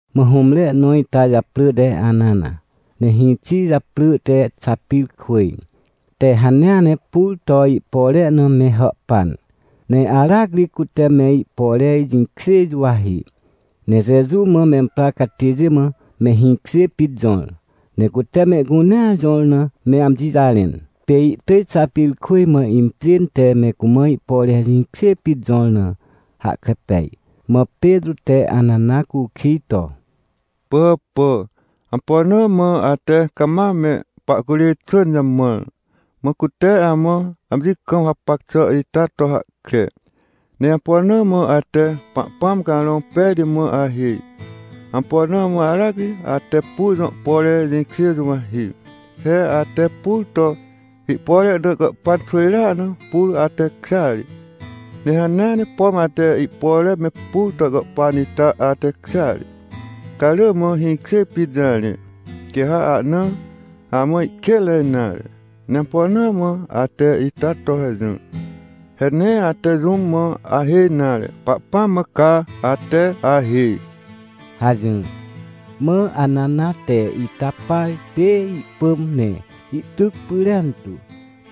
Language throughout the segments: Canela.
Mã hũmre nõ ita japrỳ te Anana, ne hĩxi japrỳ te Xapirkwỳj, te hanea ne pur to ihpore na me hàhpan. Ne aracri cute me ihpore jĩkjê juwahi, ne Jeju mã memprar catêjê mã me hĩkjê pit jõr. Ne cute mehcunea jõr na me amji jarẽn. Pê ihtỳj Xapirkwỳj mã impjên te me cumã ihpore jĩkjê pit jõr na hahkre pej. Mã Petrô te Anana cukij to: — Pỳhàpà, ampo na mã ate cama me pahcurê xwỳn jamãr, mã cute amã amji kam hapac xà ita to hahkre? Ne ampo na mã ate Pahpãm Carõ Pejti mã ahêj? Ampo na mã aracri ate pur jõ pore jĩkjê juwahi? He ate pur to ihpore na gàhpan xwỳjrea na, pur atekjêa ri, ne hanea ne, pom ate ihpore me pur to gàhpan ita atekjêa ri. Ca rỳ mã hĩkjê pit jarẽ, quê ha ahna amã ihkênre nare. Ne ampo na mã ate ita to hajỹr? He nee ate jũm mã ahêj nare, Pahpãm mã ca ate ahêj — hajỹr. Mã Anana te ita par pê ihpỳm ne ihtyc pyrentu.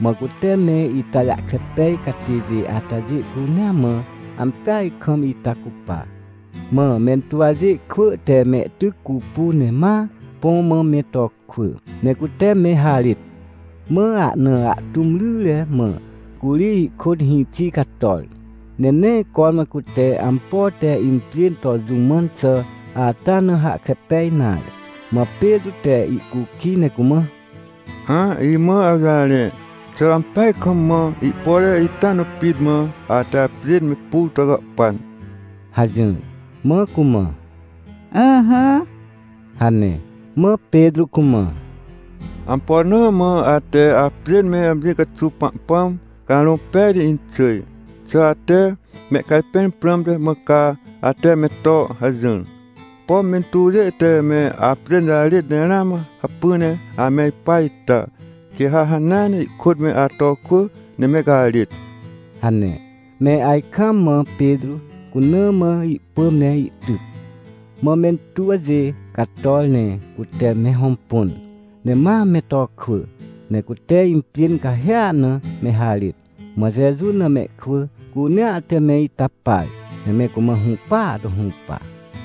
Mã cute me ita jahkre pej catêjê atajê cunea mã ampeaj kam ita cupa. Mã mentuwjê kwỳ te mehtyc cupu, ne ma põ mã me to kwỳ, ne cute me harêt. Mã ahna ahtũm ryre mã curi ihkôt hĩxi cator, ne nee cormã cute ampo te impjên to jũ mãn xà ata na hahkre pej nare. Mã Petrô te ihcukij ne cumã: — Hã, imã awjarẽ, xà ampeaj kam mã ihpore ita na pit mã ate apjên me pur to gàhpan? — hajỹr. Mã cumã: — Ỹhỹ — hane. Mã Petrô cumã: — Ampo na mã ate apjên me amji caxuw Pahpãm Carõ Pejti inxỳj? Xà ate mehcajpẽr prãmte mã ca ate me to hajỹr? Pom mentuwjê te me apjên jarêt ne ramã hacpỹ ne ame ipa ita, quê ha hanea ne ihkôt me ato kwỳ ne me garêt — hane. Me ajkaam mã Petrô cuna mã ihpỳm ne ihtyc. Mã mentuwjê cator, ne cute me hõmpun, ne ma me to kwỳ ne cute impjên cahêa na me harêt. Mã Jeju na mehkwỳ cunea te me ita par, ne me cumã hũpaa to hũpa.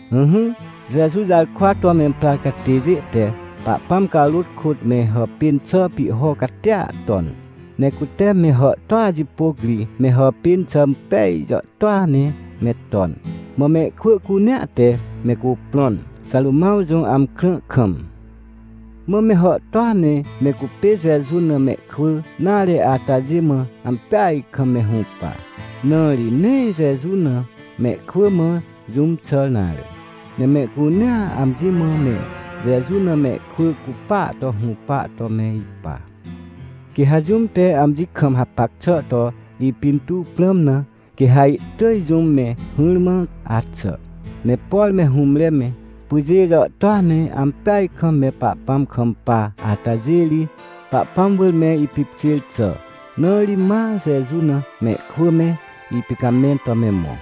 Ỹhỹ, Jeju jarkwa to memprar catêjê te Pahpãm carôt kôt me hàpên xà pihho catia ton. Ne cute me hàhtôa jipôc ri me hàpên xà impej jàhtôa ne me ton. Mã mehkwỳ cunea te me cuprõn, Xarômãw jõ amkrã kam. Mã me hàhtôa ne me cupê Jeju na mehkwỳ nare atajê mã ampeaj kam me hũpa, na ri nee Jeju na mehkwỳ mã jũm xàr nare. Ne mehcunea amji mã me Jeju na mehkwỳ cupa to hũpa to me ipa. Quê ha jũm te amji kam hapac xà to ipintuw prãm na, quê ha ihtỳj jũm me hỹrmã axà. Ne por me hũmre me, pyjê jàhtôa ne ampeaj kam me Pahpãm kampa atajê ri, Pahpãm wỳr me ipipkjêr xà, na ri ma Jeju na mehkwỳ me ipicamẽn to me mõ.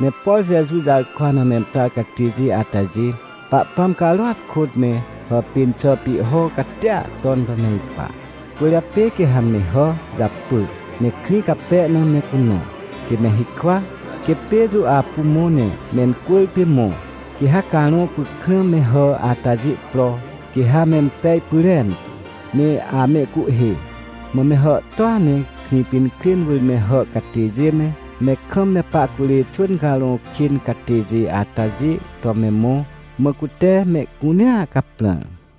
Ne por Jeju jarkwa na memprar catêjê atajê, Pahpãm carôat kôt me hàpên xà pihho catia ton to me ipa. Cwỳrjapê quê ha me hà japỳ, ne krĩ cape na me cunõ, quê me hikwa, quê Petrô apu mõ ne mencwỳrpê mõ, quê ha carõ pykrã me hà atajê pro, quê ha mempej pyrentu, ne amehcuhhê. Mã me hàhtôa ne Krĩpinkrên wỳr me hà catêjê me, me kam me pahcurê xwỳn carõ kên catêjê atajê to me mõ, mã cute mehcunea caprãr.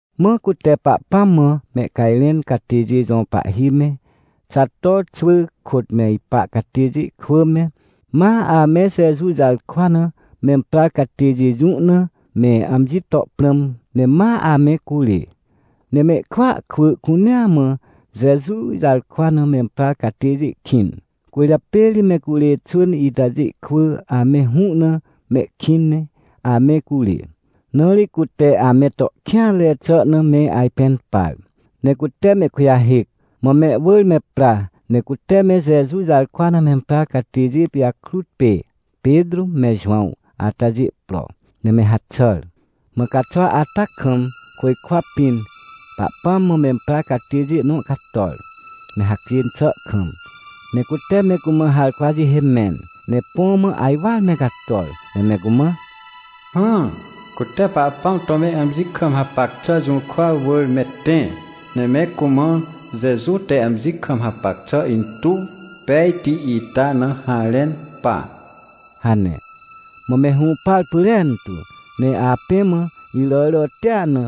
Mã cute Pahpãm mã mehcajrẽn catêjê jõ pahhi me, Xato xwỳ kôt me ipa catêjê kwỳ me, ma ame Jeju jarkwa na memprar catêjê jũ na me amji to prãm ne ma ame curê. Ne mehkwỳa kwỳ cunea mã Jeju jarkwa na memprar catêjê kĩn, cwỳrjapê ri me curê xwỳn itajê kwỳ ame hũ na mehkĩn ne ame curê. Na ri cute ame to kêanre xà na me ajpẽn par. Ne cute mehkujahêc, mã mehwỳr me pra, ne cute me Jeju jarkwa na memprar catêjê pijakrut pê Petrô me Jowãw atajê pro, ne me haxàr. Mã caxwa ata kam, côjkwa pĩn, Pahpãm mã memprar catêjê nõ cator, me hacjên xà kam, ne cute me cumã harkwa jihê mẽn, ne põ mã ajwar me cator, ne me cumã: — Hã, cute Pahpãm to me amji kam hapac xà jũrkwa wỳr me tẽ, ne me cumã Jeju te amji kam hapac xà intuw pejti ita na harẽn pa — hane. Mã me hũpar pyrentu, ne apẽ mã, iràràtia na,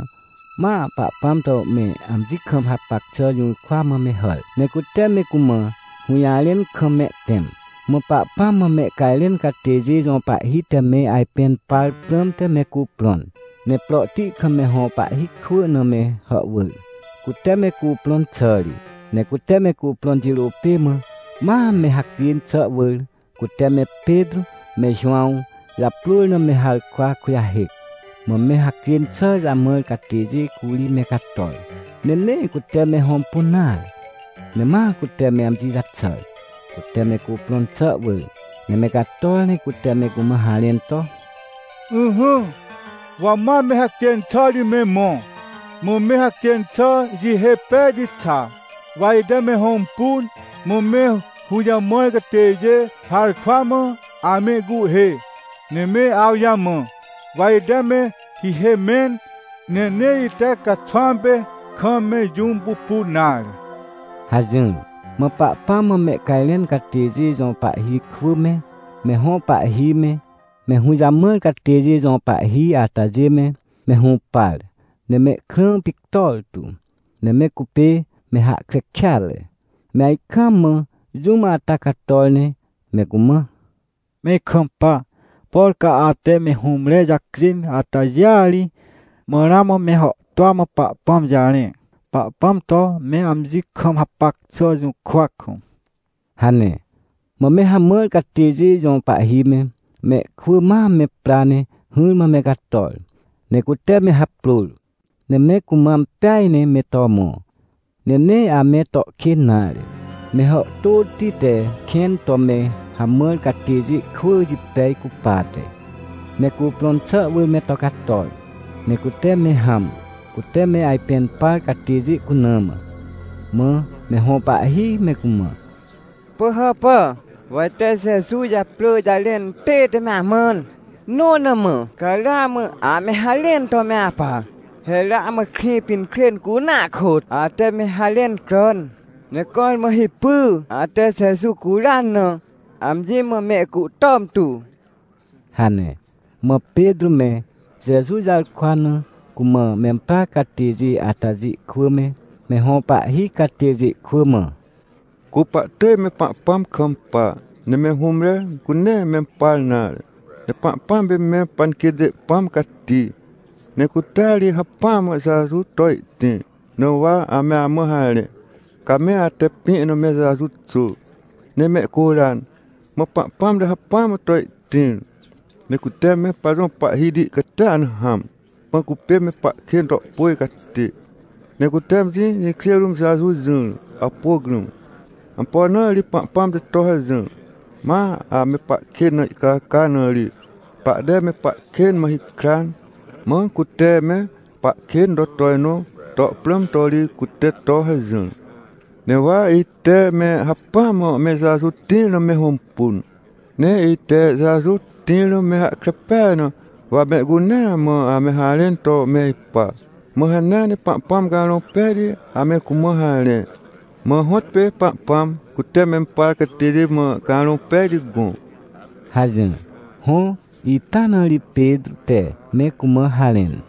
ma Pahpãm to me amji kam hapac xà jũrkwa mã me hàr, ne cute me cumã hũjarẽn kam mehtẽm. Mã Pahpãm mã mehcajrẽn catêjê jõ pahhi te me ajpẽn par prãmte me cuprõn, ne prohti kam me hõ pahhi kwỳ na me hàhwỳr, cute me cuprõn xà ri. Ne cute me cuprõn jirô pê mã ma me hacjên xà wỳr, cute me Petrô me Jowãw japrôr na me harkwa kujahêc. Mã me hacjên xà jamãr catêjê curi me cator, ne nee cute me hõmpun nare. Ne ma cute me amji jaxàr, cute me cuprõn xà wỳr, ne me cator ne cute me cumã me harẽn to: — Ỹhỹ, wa ma me hacjên xà ri me mõ, mã me hacjên xà jihê pejti xa, wa ite me hõmpun, mã me hũjamãr catêjê harkwa mã amehcuhhê, ne me awjamã. Wa ite me hihê mẽn, ne nee ite caxwãm pê, kam me jũm pupun nare — hajỹr. Mã Pahpãm mã mehcajrẽn catêjê jõ pahhi kwỳ me, me hõ pahhi me, me hũjamãr catêjê jõ pahhi atajê me, me hũpar, ne mehkrã pictor tu, ne me cupê me hahkre kêatre. Me ajkaam mã jũm ata cator ne me cumã: — Me ikampa, por ca ate me hũmre jacjên atajêa ri ma ramã me hàhtôa mã Pahpãm jarẽ, Pahpãm to me amji kam hapac xà jũrkwa kam — hane. Mã me hamãr catêjê jõ pahhi me, mehkwỳ ma me pra ne hỹrmã me cator, ne cute me haprôr. Ne me cumã ampeaj ne me to mõ. Ne nee ame to kên nare, me hàhtôti te kẽn to me hamãr catêjê kwỳ jipej cupate. Ne cuprõn xà wỳr me to cator, ne cute me hãm, cute me ajpẽn par catêjê cuna mã. Mã me hõ pahhi me cumã: — Pỳhàpà, wa ite Jeju japrỳ jarẽn tête me amãn, nõ na mã ca ramã ame harẽn to me apa! He ramã Krĩpinkrên cunea kôt ate me harẽn cràn! Ne cormã hipy ate Jeju curan na, amji mã me icuhtom tu — hane. Mã Petrô me, Jeju jarkwa na cumã memprar catêjê atajê kwỳ me, me hõ pahhi catêjê kwỳ mã: — Cu pahtỳj me Pahpãm kampa, ne me hũmre cu nee mempar nare. Ne Pahpãm pê me panquêtjê Pãm Cati, ne cutea ri hacpỹa mã Jeju to ihtĩr, na wa ame amã harẽ. Ca me ate pĩ na me Jeju xôr, ne mehcuran, mã Pahpãm te hacpỹa mã to ihtĩr. Ne cute me pajõ Pahhiti catia na hãm, mã cupê me pahkên to pôj catê. Ne cute amji jĩkjê rũm Jeju jỹr, awpôc rũm. Ampo na ri Pahpãm te to hajỹr? Ma ame pahkên na ihcaca na ri pahte me pahkên mã hikran, mã cute me pahkên to tojnõ to prãm to ri cute to hajỹr. Ne wa ite me hacpỹa mã me Jeju tĩr na me hõmpun. Ne ite Jeju tĩr na me hahkre peaj na wa mehcunea mã ame harẽn to me ipa. Mã hanea ne Pahpãm Carõ Pejti ame cumã harẽ. Mã hõtpê Pahpãm, cute mempar catêjê mã Carõ Pejti gõ — hajỹr. Hõ, ita na ri Petrô te me cumã harẽn.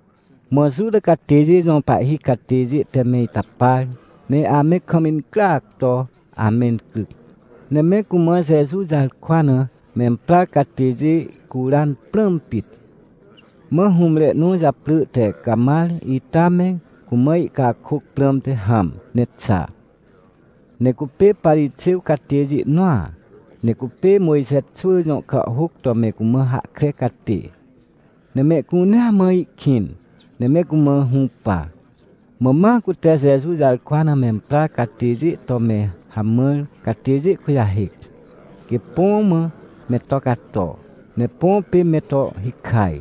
Mã Juta catêjê jõ pahhi catêjê te me ita par, ne ame kam mencryac to amencryc. Ne me cumã Jeju jarkwa na memprar catêjê ihcuran prãm pit. Mã hũmre nõ japrỳ te Camar ita me cumã ihcakôc prãmte hãm ne xa. Ne cupê Parixêw catêjê nõa, ne cupê Mojxe xwỳ jõ kàhhôc to me cumã hahkre catê. Ne mehcunea mã ihkĩn, ne me cumã hũpa. Mã ma cute Jeju jarkwa na memprar catêjê to me hamãr catêjê kujahêc, quê põ mã me to cato, ne põ pê me to hikaj.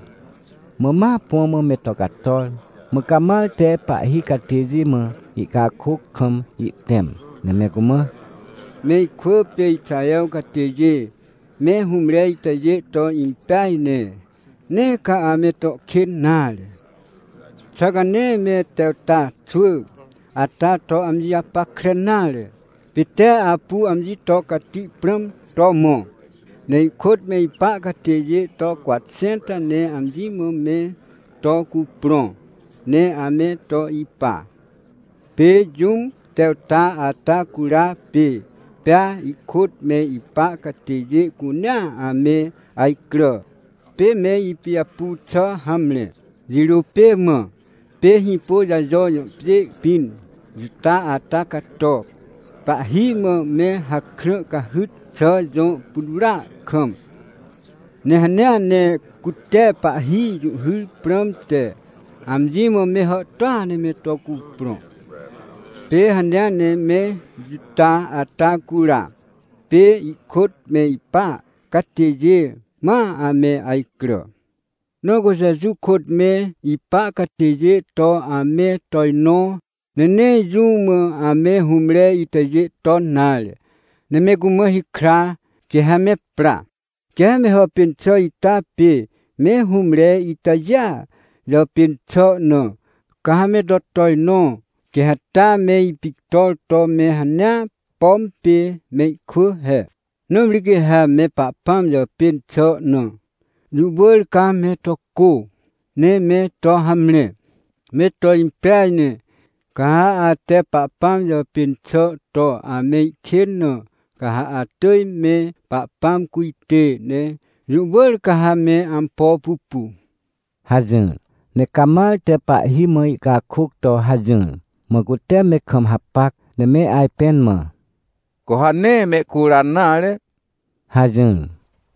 Mã ma põ mã me to cator. Mã Camar te pahhi catêjê mã ihcakôc kam ihtẽm, ne me cumã: — Me ikwỳ pê Ixaher catêjê, me hũmre itajê to impeaj ne, nee ca ame to kên nare. Xà ca nee me Tewta xwỳ ata to amji japackre nare? Pê tee apu amji to cati prãm to mõ. Ne ihkôt me ipa catêjê to cwatxẽnta ne amji mã me to cuprõ, ne ame to ipa. Pê jũm Tewta ata cura, pê pea ihkôt me ipa catêjê cunea ame ajcrà. Pê me ipijapu xà hamre. Jirô pê mã pê Hĩpôjajo jõ pjê pĩn Juta ata cato, pahhi mã me hakrã cahyt xà jõ putwrỳa kam. Ne hanea ne cute pahhi jũhhyr prãmte amji mã me hàhtôa ne me to cuprõ. Pê hanea ne me Juta ata cura, pê ihkôt me ipa catêjê ma ame ajcrà. Na cu Jeju kôt me ipa catêjê to ame tojnõ, ne nee jũ mã ame hũmre itajê ton nare, ne me cumã hikra, quê ha me pra. Quê ha me hàpên xà ita pê me hũmre itajêa jàpên xà na, ca ha me to tojnõ quê ha taa me ipictor to me hanea, pom pê mehkwỳ he. Nãmri quê ha me Pahpãm jàpên xà na, jũ wỳr ca me to cô ne me to hamre. Me to impeaj ne, ca ha ate Pahpãm jàpên xà to amehkên na, ca ha atỳj me Pahpãm cujtê, ne jũ wỳr ca ha me ampo pupu — hajỹr. Ne Camar te pahhi mã ihcakôc to hajỹr, mã cute me kam hapac, ne me ajpẽn mã: — Cu ha nee mehcuran nare — hajỹr.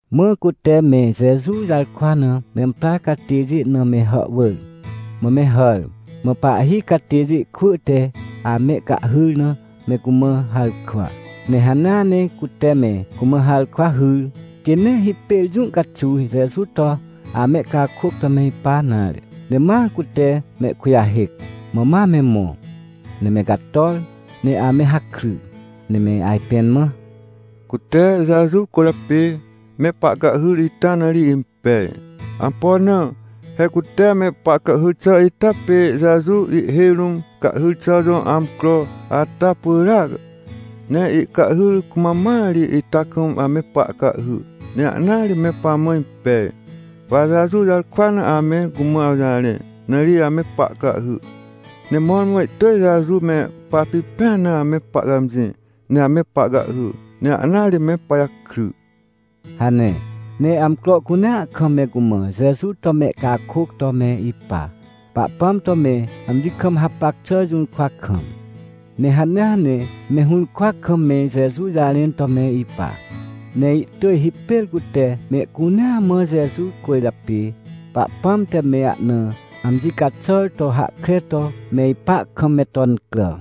Mã cute me Jeju jarkwa na memprar catêjê na me hàhwỳr, mã me hàr. Mã pahhi catêjê kwỳ te amehcahhyr na me cumã harkwa. Ne hanea ne cute me cumã harkwa hyr, quê nee hipêr jũ caxuw Jeju to amehcakôc to me ipa nare. Ne ma cute mehkujahêc, mã ma me mõ. Ne me cator, ne ame hakry, ne me ajpẽn mã: — Cute Jeju cwỳrjapê me pahcahhyr ita na ri impej. Ampo na? He cute me pahcahhyr xà ita pê Jeju ihhêj rũm cahhyr xà jõ amcro ata pyràac. Ne ihcahhyr cumam mãa ri ita kam ame pahcahhy, ne ahnaa ri me pamã impej. Wa Jeju jarkwa na ame cumã awjarẽ, na ri ame pahcahhy. Ne mõrmõ ihtỳj Jeju me papipẽan na ame pahcãmjĩ, ne ame pahcahhy. Ne ahna ri me pajakry — hane. Ne amcro cunea kam me cumã Jeju to mehcakôc to me ipa, Pahpãm to me amji kam hapac xà jũrkwa kam. Ne hanea ne me hũrkwa kam me Jeju jarẽn to me ipa. Ne ihtỳj hipêr cute mehcunea mã Jeju cwỳrjapê Pahpãm te me ahna amji caxàr to hahkre to me ipa kam me to incrà.